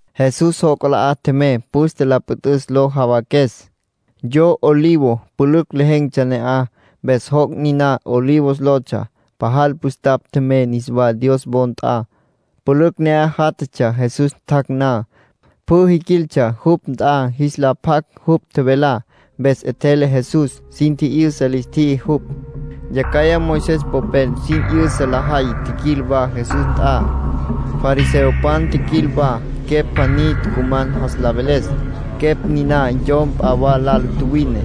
Jesús joc' 'alá tjemey püste la püt'üs lo jawaques. Yo olivo pülücj lejen̈tsja ne'aj, mpes joc' niná “Olivos” lotsja. Pajal püstapj tjemey niswá Dios wo nt'a. Pülücj ne'aj játjatsja, Jesús tjac' na. Pjü jiquiltsja jupj nt'a jis la pjac jupj tjevelá. Mpes 'etjele Jesús, sin tji'yüsa lis tjiji jupj. Yacjaya Moisés popel sin 'yüsa lajay tjiquil wa Jesús nt'a. Fariseopan tjiquil wa. Quepj pjaní tucuman jas la veles. Quepj niná yom p'a lal tjuwine,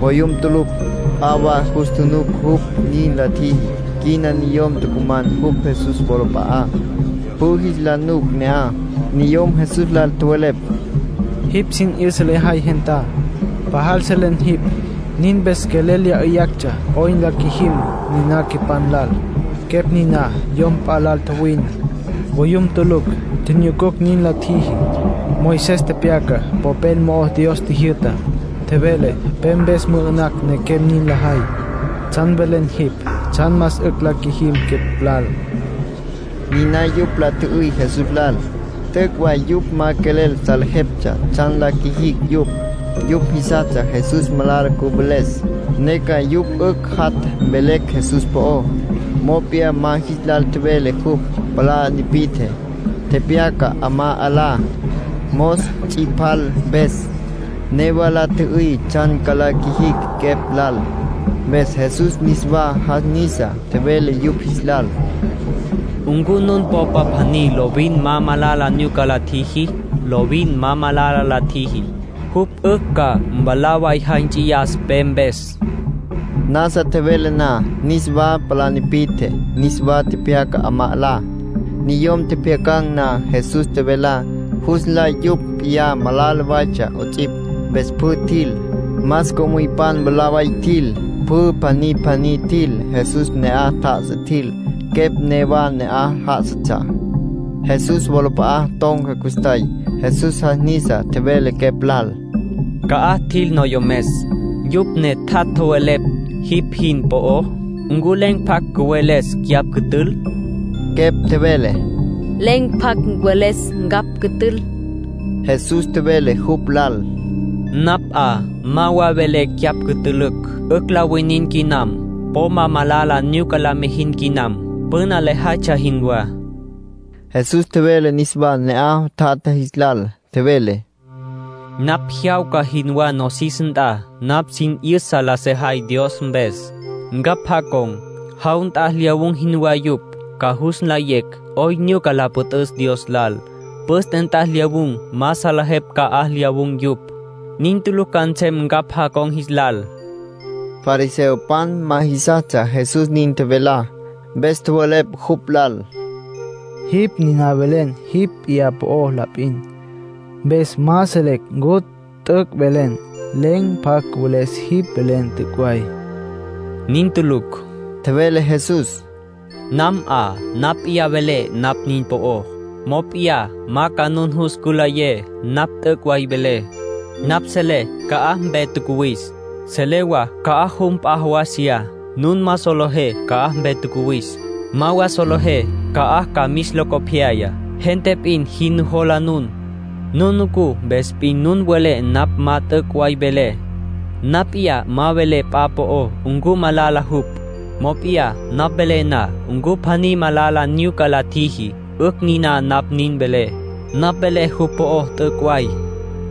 voyum tulucj. P'a wa jus tjunuc jupj nin la tjiji. Quina niyom tucuman jupj Jesús wolap'a'á, pjü jis la nuc ne'aj. Niyom Jesús lal tjowelepj: —Jipj sin 'yüsa lejay gentá. Pajal selen jipj. Nin mpes quelel lya 'yüyactsja 'oyn la qjuijim niná quepan lal. Quepj niná yom p'a lal tjuwine, voyum tulucj. Tjinyucucj nin la tjiji. Moisés tepyaca popel mo'ó Dios tjijyü'tá. Tjevele pe mpes mü'ü'nacj nequem nin lajay. ¿Tsjan velen jipj tsjan más 'ücj la qjuijim quepj lal? —niná yupj la tjü'üy Jesús lal. T'üc' way yupj ma quelel salejeptsja tsjan la qjuijicj yupj. Yupj jisastsja Jesús malala cüveles, ne ca yupj 'ücj jat' mvelecj Jesús po'ó. Mop'iyá ma jis lal tjevele jupj. Palá tipi'tje, tepyaca 'amá 'alá, mos ts'ipal mpes. Newa la tjü'üy tsjan la qjuijicj quepj lal, mpes Jesús niswa jas nisa, tjevele yupj jis lal: —¿Ncu nun popa pjaní lovin ma malala nyuca la tjiji? Lovin ma malala la tjiji, jupj 'ücj ca mwalá way jay nts'iyas pe mpes. Nasa tjevele na, niswa palá tipi'tje, niswa tepyaca 'amá 'alá. Niyom tjepjyacan̈ na Jesús tjevelá, jus nlay yupj p'iyá malala waytsja 'ots'ipj. Mpes pjü tjil. Más co'müypan mwalá way tjil; pjü pjaní pjaní tjil. Jesús ne'aj tjá'asa tjil. Quepj newa ne'aj já'asatsja. Jesús wolap'a'a ton̈ca custjay. Jesús jas nisa, tjevele quepj lal: —¿Ca'aj tjil noyomes, yupj ne tjat' tjowelepj jipj jin po'ó? ¿Ncu len̈ pjacj cüweles cyapj cütül? Quepj tjevele: —Len̈ pjacj cüweles ncapj cütül. Jesús tjevele jupj lal: —Napj 'a ma wa velé cyapj cütülücj. 'Ücj la winin quinam. Po ma malala nyuca la mijin quinam, püna lejaytsja jinwá. Jesús tjevele niswá ne'aj tjatja jis lal. Tjevele: —Napj jyawca jinwá nosis nt'a. Napj sin 'yüsa la sejay Dios mpes. Ncapj jacon̈, jaw nt'a lyawun̈ jinwá yupj. Ca jus nlayecj 'oyn nyuca la püt'üs Dios lal. Püste nt'a lyawun̈ ma salejepj ca'aj lyawun̈ yupj. Nin tulucj ca nsem ncapj jacon̈ jis lal —nin tjevele Jesús. Fariseopan ma jisastsja Jesús nin tjevelá, mpes tjowelepj jupj lal: —Jipj niná velen jipj p'iyá po'ó la p'in, mpes ma selecj ncu t'üc' velen. Len̈ pjacj cüweles jipj velen t'üc' way. —Nin tulucj —tjevele Jesús—. Nam 'a napj p'iyá velé napj nin po'ó, mop'iyá ca nun jus cülayé napj t'üc' way velé. Napj selé ca'aj mpe tjacuwis. Selé wa ca'aj jum p'a jawasiyá. Nun ma solejé ca'aj mpe tjacuwis. Ma wa solejé ca'aj ca mis locopyayá. Gente p'in jin nujola nun. Nun nucú mpes p'in nun welé napj ma t'üc' way velé. Napj p'iyá ma velé p'a po'ó ncu malala jupj. Mop'iyá napj velé na ncu pjaní malala nyuca la tjiji, 'ücj niná napj nin velé. Napj velé jupj po'ó t'üc' way.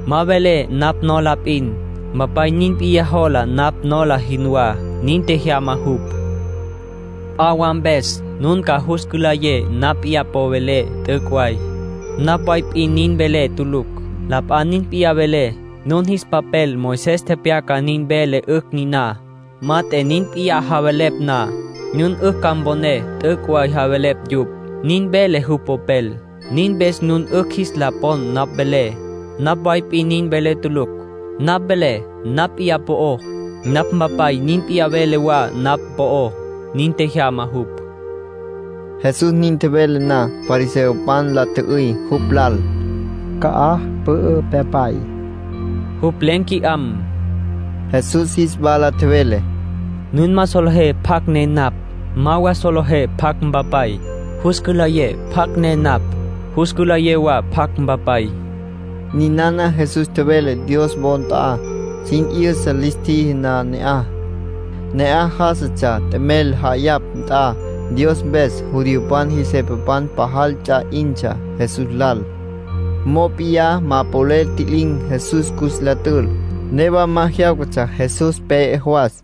Ma velé napj nola p'in. Mpapay nin p'iyá jola napj nola jinwá. Nin tjejyama jupj. ”P'a wa mpes nun ca jus cülayé napj p'iyá po'ó velé t'üc' way. Napj way p'in nin velé tulucj. La p'a nin p'iyá vele. Nun jis papel Moisés tepyacá nin vele 'ücj niná. Mat'e nin p'iyá javelepj na, nun 'ücj ca mponé t'üc' way javelepj yupj. Nin vele jupj popel. Nin mpes nun 'ücj jis la pon napj velé. Napj way p'in nin velé tulucj. Napj velé napj p'iyá po'ó, napj Mpapay nin p'iyá vele wa napj po'ó. Nin tjejyama jupj. Jesús nin tjevele na, fariseopan la tjü'üy jupj lal: —¿Ca'aj pü'ü pyapay? Jupj len̈ qui'am. Jesús jis wala tjevele: —Nun ma solejé pjacj ne napj. Ma wa solejé pjacj Mpapay. Jus cülayé pjacj ne napj, jus cülayé wa pjacj Mpapay. Ninana Jesús tjevele Dios wo nt'a, sin 'yüsa lis tjiji na ne'aj. Ne'aj já'asatsja t'emel ja'ayapj nt'a Dios mpes. Judiopan jis jepapan pajal ts'a 'intsja Jesús lal, mop'iyá ma polel ntji'lin̈ Jesús cus la tül. Newa ma jyáwcatsja Jesús pe'e jawas.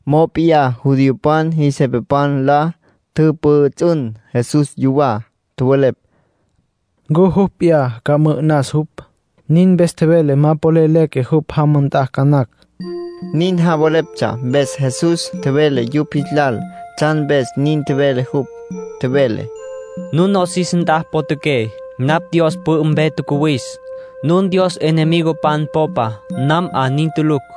Mop'iyá judiopan jis jepapan la tjüpjüts'ün Jesús yuwá. Tjowelepj: “¿Ncu jupj p'iyá ca mü'ü'nas jupj? Nin mpes tjevele ma polel leque jupj jama nt'a ca nacj.” Nin javeleptsja mpes, Jesús tjevele yupj jis lal tsjan mpes nin tjevele jupj. Tjevele: —Nun nosis nt'a potjaqué. Napj Dios pü'ü mpe tjacuwis. Nun Dios enemigopan popa. Nam 'a nin tulucj.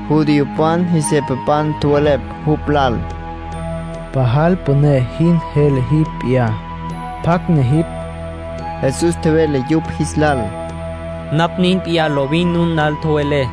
Judiopan jis jepapan tjowelepj jupj lal: —Pajal püné jin jele jipj p'iyá. ¿Pjacj ne jipj? Jesús tjevele yupj jis lal: —Napj nin p'iyá lovin nun lal tjevelé.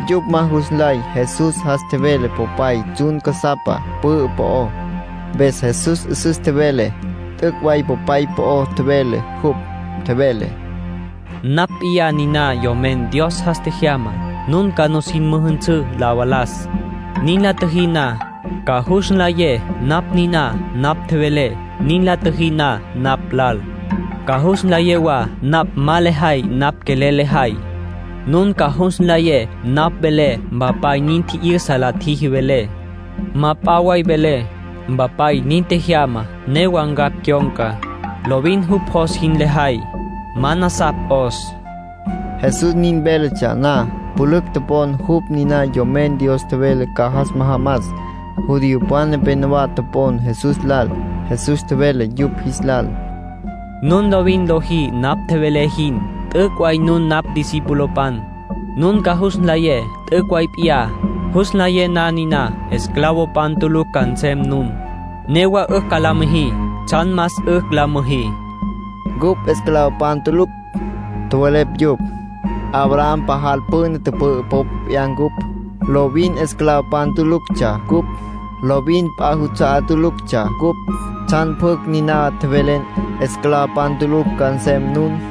Yupj ma jus nlay Jesús jas tjevele Popay tsjun casapa pü'ü po'ó. Mpes Jesús 'üsüs tjevele t'üc' way Popay po'ó tjevele jupj. Tjevele: —Napj p'iyá niná Yomen Dios jas tjejyamá. Nun ca nin müjünsǘ la valas. Nin la tjüjí na, ca jus nlayé napj niná napj tjevelé. Nin la tjüjí na napj lal, ca jus nlayé wa napj ma lejay napj quelel lejay. Nun ca jus nlayé napj velé Mpapay nin tji'yüsa la tjiji velé. Ma p'a way velé. Mpapay nin tjejyama, newa ncapj cyon̈ca. Lovin jupj jos jin lejay. Ma nasapj 'os. Jesús nin véletsja na, pülücj topon jupj niná Yomen Dios tjevele ca jas majamas. Judiopan nepénowa topon Jesús lal. Jesús tjevele yupj jis lal: —Nun lovin lojí napj tjevelé jin, t'üc' way nun napj discipulopan. Nun ca jus nlayé t'üc' way p'iyá. Jus nlayé na niná, esclavopan tulucj ca nsem nun. Newa 'ücj ca la müjí tsjan más 'ücj la müjí. —¡Cupj esclavopan tulucj! —tjowelepj yupj—. Abraham pajal püna tüpü'ü popa p'iyá ncupj. Lovin esclavopan tuluctsja ncupj. Lovin p'a juts'a'á tuluctsja cupj. ¿Tsjan pjucj niná tjevelen: ‘Esclavopan tulucj ca nsem nun?’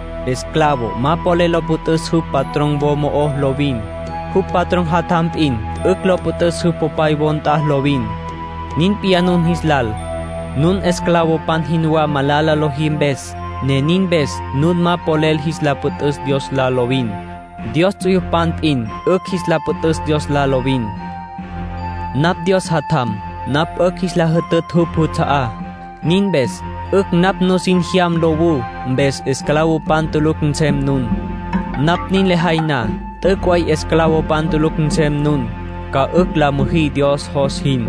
Esclavo ma polel lo püt'üs jupj patrón wo mo'ó lovin. Jupj patrón jatjam p'in 'ücj lo püt'üs jupj popay wo nt'a lovin. Nin p'iyá nun jis lal. Nun esclavopan jinwá malala lojí mpes, ne nin mpes nun ma polel jis la püt'üs Dios lal lovin. Dios ts'uyupan p'in 'ücj jis la patj Dios lal lovin. Napj Dios Jatjam. Napj 'ücj jis la jütütj jupj juts'a'á. Nin mpes 'ücj napj nusin jyam nlawú, mpes esclavopan tulucj nsem nun. Napj nin lejay na, t'üc' way esclavopan tulucj nsem nun. Ca 'ücj la müjí Dios jos jin.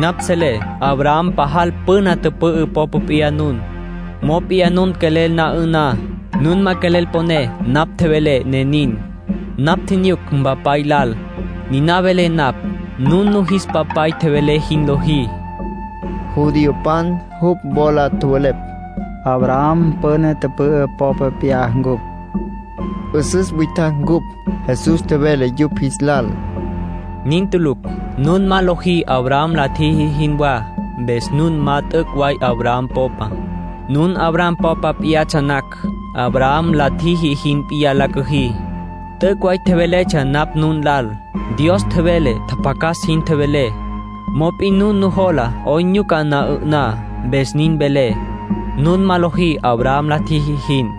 ”Napj selé Abraham pajal püna tüpü'ü popa p'iyá nun. Mop'iyá nun quelel na 'ü'ná. Nun ma quelel poné napj tjevelé, ne nin. Napj tjinyuc Mpapay lal, niná velé napj. Nun nun jis papay tjevele jin lojí —tjevele Jesús. Judiopan jupj wola tjowelepj: —Abraham püna tüpü'ü popa p'iyá ncupj. ('Üsüs witjacj ncupj.) Jesús tjevele yupj jis lal: —Nin tulucj. Nun ma lojí Abraham la tjiji jinwá. Mpes nun ma t'üc' way Abraham popa. Nun Abraham popa p'iyatsja nacj, Abraham la tjiji jin p'iyá la cüjí. T'üc' way tjeveletsja napj nun lal. Dios tjevele tjapjacas jin tjevelé. Mop'in nun nujola 'oyn nyuca na 'ü'ná. Mpes nin velé, nun ma lojí Abraham la tjiji jin.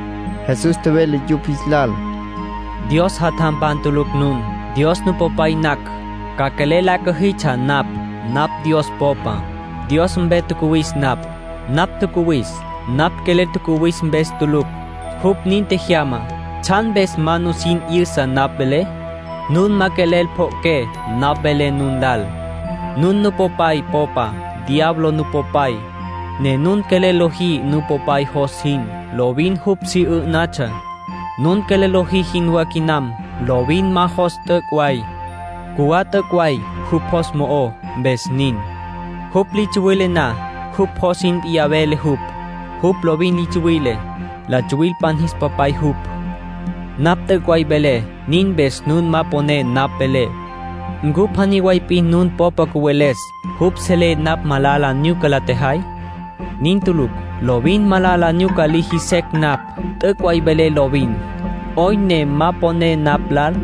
Jesús tjevele yupj jis lal: —Dios jatjampan tulucj nun. Dios Nupopay nacj, ca quelel la cüjitsja napj. Napj Dios Popa; Dios mpe tjacuwis napj. Napj tjacuwis napj quelel tjacuwis mpes tulucj. Jupj nin tjejyama. ¿Tsjan mpes ma nusin 'yüsa napj velé? Nun ma quelel pjo'oqué napj velé nun lal. Nun nupopay popa. Diablo nupopay, ne nun quelel lojí nupopay jos jin. Lovin jupj si 'ǘ'natsja (nun quelel lojí jinwá quinam). Lovin ma jos t'üc' way. Cjuwá t'üc' way jupj jos mo'ó, mpes nin. Jupj li tsuwile na, jupj jos jin p'iyá vele jupj. Jupj lovin li tsuwile; la tsuwilpan jis popay jupj. ”Napj t'üc' way velé. Nin mpes nun ma poné napj velé. ¿Ncu pjaní way p'in nun popa cüweles jupj selé napj malala nyuca la tjejay? Nin tulucj. (Lovin malala nyuca liji secj napj.) T'üc' way velé lovin. ¿'Oyn ne ma poné napj lal?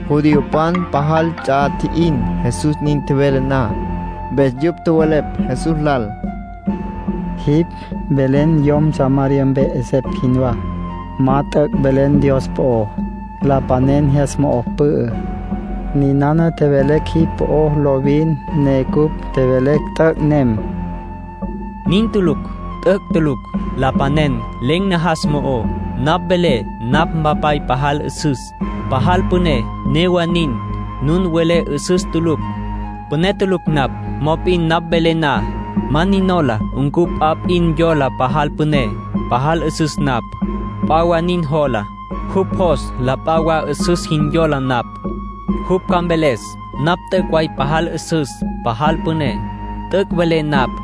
Judiopan pajal ts'a tji'in Jesús nin tjevele na. Mpes yupj tjowelepj Jesús lal: —Jipj velen yom Samaria mpe 'esepj jinwá. Ma t'üc' velen Dios po'ó. Lapanen jyas mo'o pü'ü. Ninana tjevelecj jipj po'ó lovin, ne cupj tjevelecj, t'üc' nem. —Nin tulucj. T'üc' tulucj —tjevele Jesús—. Lapanen len̈ najas mo'ó. Napj velé napj Mpapay pajal 'üsüs, pajal püné; newa nin, nun welé 'üsüs tulucj, püné tulucj napj. Mop'in napj velé na, ma nin nola ncu p'a nin yola pajal püné, pajal 'üsüs napj. P'a wa nin jola. Jupj jos la p'a wa 'üsüs jin yola napj. Jupj ca mveles napj t'üc' way pajal 'üsüs, pajal püné. T'üc' velé napj.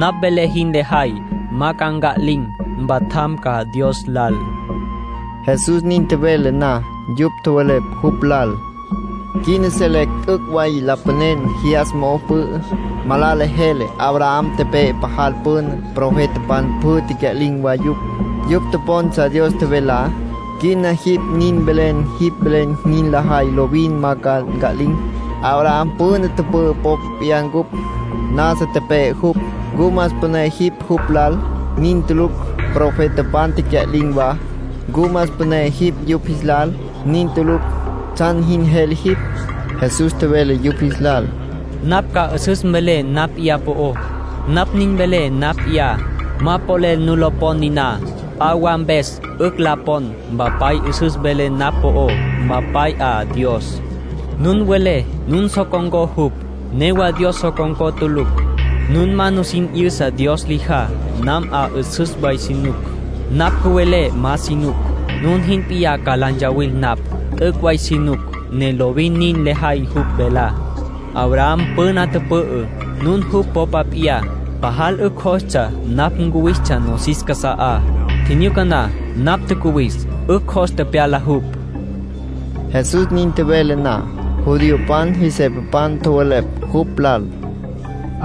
Napj velé jin lajay ma ca nca'lin̈. Mpatjam ca Dios lal. Jesús nin tjevele na, yupj tjowelepj jupj lal: —Quina selecj t'üc' way lapanen jyas mo'o pü'ü. Malala jele. Abraham tepe'e pajal püna. Profetapan pjü tecya'lin̈ wa yupj; yupj topontsja Dios tjevelá. Quina jipj nin velen jipj velen jin lajay lovin ma ca nca'lin̈. Abraham püna tüpü'ü popa p'iyá cupj. Nasa tepe'e jupj. ¿Ncu más püné jipj jupj lal? Nin tulucj. Profetapan tecya'lin̈ wa. ¿Ncu más püné jipj yupj jis lal? Nin tulucj. ¿Tsjan jin jele jipj? Jesús tjevele yupj jis lal: —Napj ma 'üsüs velé napj p'iyá po'ó. Napj nin velé napj p'iyá, ma polel nu lo pon niná. P'a wa mpes 'ücj la pon. Mpapay 'üsüs vele napj po'ó. Mpapay 'a Dios; nun welé nun so con̈có jupj. Newa Dios so con̈có tulucj. Nun ma nusin 'yüsa Dios lijá. Nam 'a 'üsüs way si nuc. Napj cüvelé ma si nuc, nun jin p'iyá ca la ntsawil napj. T'üc' way si nuc, ne lovin nin lejay jupj velá. Abraham püna tüpü'ü, nun jupj popa p'iyá, pajal 'ücj jostsja napj ncuwistsja nosis casa'á. Tjinyuca na napj tjacuwis, 'ücj jos tepyala jupj. Jesús nin tjevele na, judiopan jis jepapan tjowelepj jupj lal: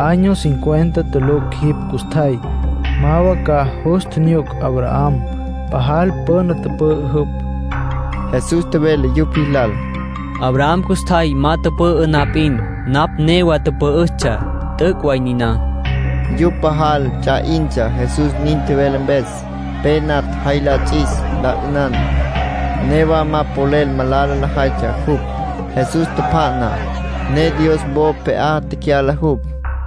—Año cincuenta tulucj jipj custjay. Ma wa ca jus tjinyuc Abraham. Pajal püna tüpü'ü jupj. Jesús tjevele yupj jis lal: —Abraham custjay ma tüpü'ü na p'in, napj newa tüpü'üstsja. T'üc' way niná. Yupj pajal ts'a 'intsja Jesús nin tjevele mpes. Pe natj jay la ts'is, la 'ünan. Newa ma polel malala lajaytsja jupj. Jesús tjapja'na, ne Dios wo pje'á tecyala jupj.